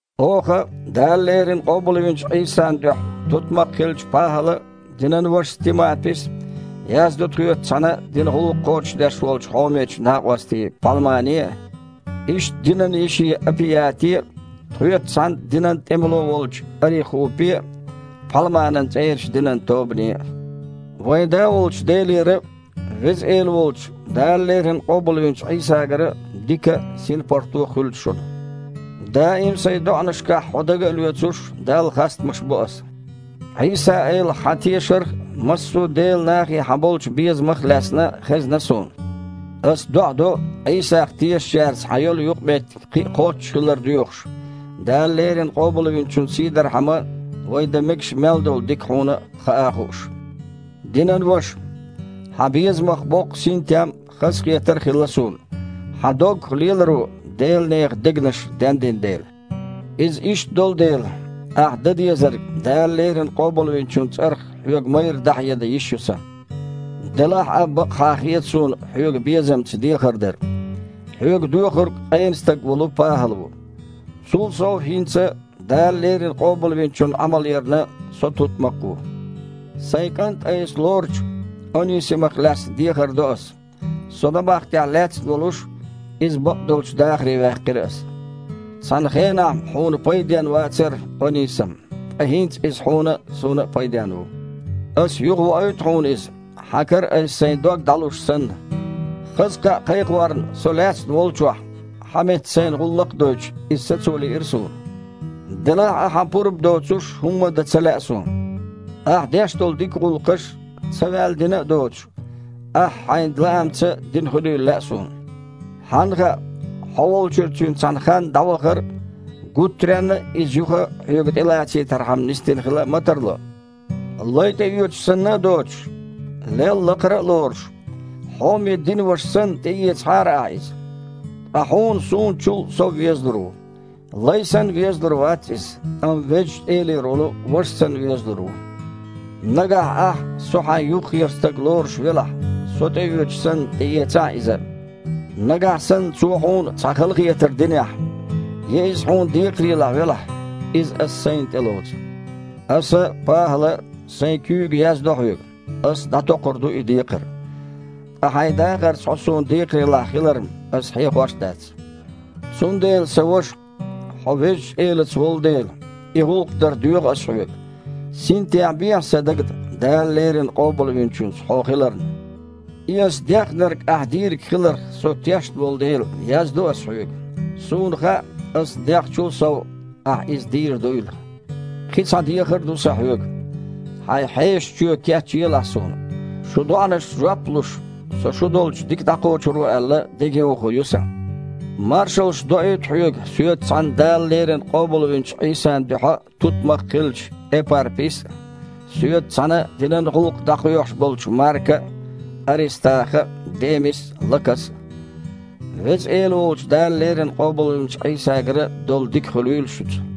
Оха, Дала леррина къобалвинчу Іийсан дуьхьа тутмакх хиллачу ПахІала а, динан вашас Тимапис а, яздо тхоьца цхьаьна динан гІуллакх кхочушдеш волчу хьомечу накъосте Пхьалмане а, иштта динан йише Апияте а, тхоьца цхьаьна динан тІемало волчу Арихупе а, Пхьалманан цІерачу динан тобане а. Вайн Да волчу Делера а, Веза Эла волчу, Дала леррина къобалвинчу Іийсагара а дика а, синпаргІато а хуьлда шуна. Даим сайн доІанашкахь хьо дага а лоьцуш, Далла хастамаш бо аса. Іийса-Элах хьан тешарх а, массо а Делан нахе хьан болчу безамах а лаьцна хезна суна. Аса доІа до Іийсах тешачаьрца хьан йолу юкъаметтиг кхин а кхоччуш хилар доьхуш, Дала леррина Къобалвинчун сийдархьама вай дан мегаш мел долу дика хьуна хаа а хууш. Динан ваша, хьан безамах боккха синтем а, хазахетар а хилла суна, хьан доггах леларо Делан нехан дегнаш дендина дела. Иза иштта долу дела, ахь дан дезарг Дала леррина Къобалвинчун цІарах хьоьга майрра дІахьедан йиш ю сан. Делахь а бакъахьа хета суна хьоьга безамца дехар дар. Хьоьга доьхург къена стаг волу ПахІал ву. Цул сов, хІинца, Дала леррина Къобалвинчунна Іамал ярна, со тутмакх а ву. Сайн кІант айса лоручу Онисамах лаьцна дехар до ас. Со набахтехь лаьцна волуш, иза бакъдолчу дахаре ваьккхира аса. Цхьана хенахь-м хьуна пайденна вацара Онисам. Ткъа хІинца иза хьуна а, суна а пайденна ву. Аса юхавоуьйту хьуна иза, хьан кара аса сайн дог дІалуш санна. Хаза кхаъ кхайкхорна со лаьцна волчохь, хьан метта сайна гІуллакх а дойтуш, иза сацо лиира суна. Делахь а хьан пурба доцуш хІумма а дан ца лаьа суна. Ахь деш долу дика гІуллакхаш, ца ваьлла дина а доцуш, ахьа хьайн лаамца дина хуьлийла лаьа суна. Хьанна хаьа: хьо волчуьра цуьнан цхьана ханна дІавахар гуттаренна а иза юха хьоьга тІелацийтархьама нисдина хила а ма тарло. Лай тІеоьцуш санна а доцуш, лел лакхара а лоруш, хьоме динан ваша санна, тІеэцахьара ахьа иза. Суна чІогІа дукха веза иза. Ткъа хьуна суна чул а сов везалур ву. Лай санна везалур вац иза, амма Везачу Элера волу ваша санна везалур ву. Нагахь ахь со хьайн юххера стаг лоруш велахь, со тІеоьцуш санна, тІеэцахьа иза а. Нагахь санна цо хьуна цхьа халахетар динехь, я иза хьуна декхарийлахь велахь, иза аса сайна тІелоцу. Аса, ПахІала, сайн куьйга яздо хьоьга: аса дІатокхур ду и декхар. Ткъа хьайн дахарца хьо суна декхарийлахь хилар-м ас хьехош а дац. Цундела, сан ваша, хьо Везачу Элаца волу дела, и гІуллакх дар доьху ас хьоьга. Синтем бехьа сан дагна Дала леррина Къобалвинчуьнца хьо хиларна. И ас дехнарг ахьа дийриг хиларх со тешна волу дела, яздо аса хьоьга. Суна хаьа, аса дехначул а сов ахьа иза дийр дуйла. Кхин цхьа дехар а ду сан хьоьга. Хьайн хьешан чоь кечъелахь суна. Шун доІанашна жоп а луш, со шу долчу дика дІакхочур ву аьлла, дегайовхо ю сан. Маршаллаш доуьйту хьоьга соьца цхьаьна Дала леррина къобалвинчу Іийсан дуьхьа тутмакх хиллачу Эпарпис а, соьца цхьаьна динан гІуллакх дІакхоьхьуш болчу Марка а, Арестаха а, Демис а, Лакас а. Веза Эла волчу Дала леррина къобалвинчу Іийсагара долу дика хуьлийла шуьца.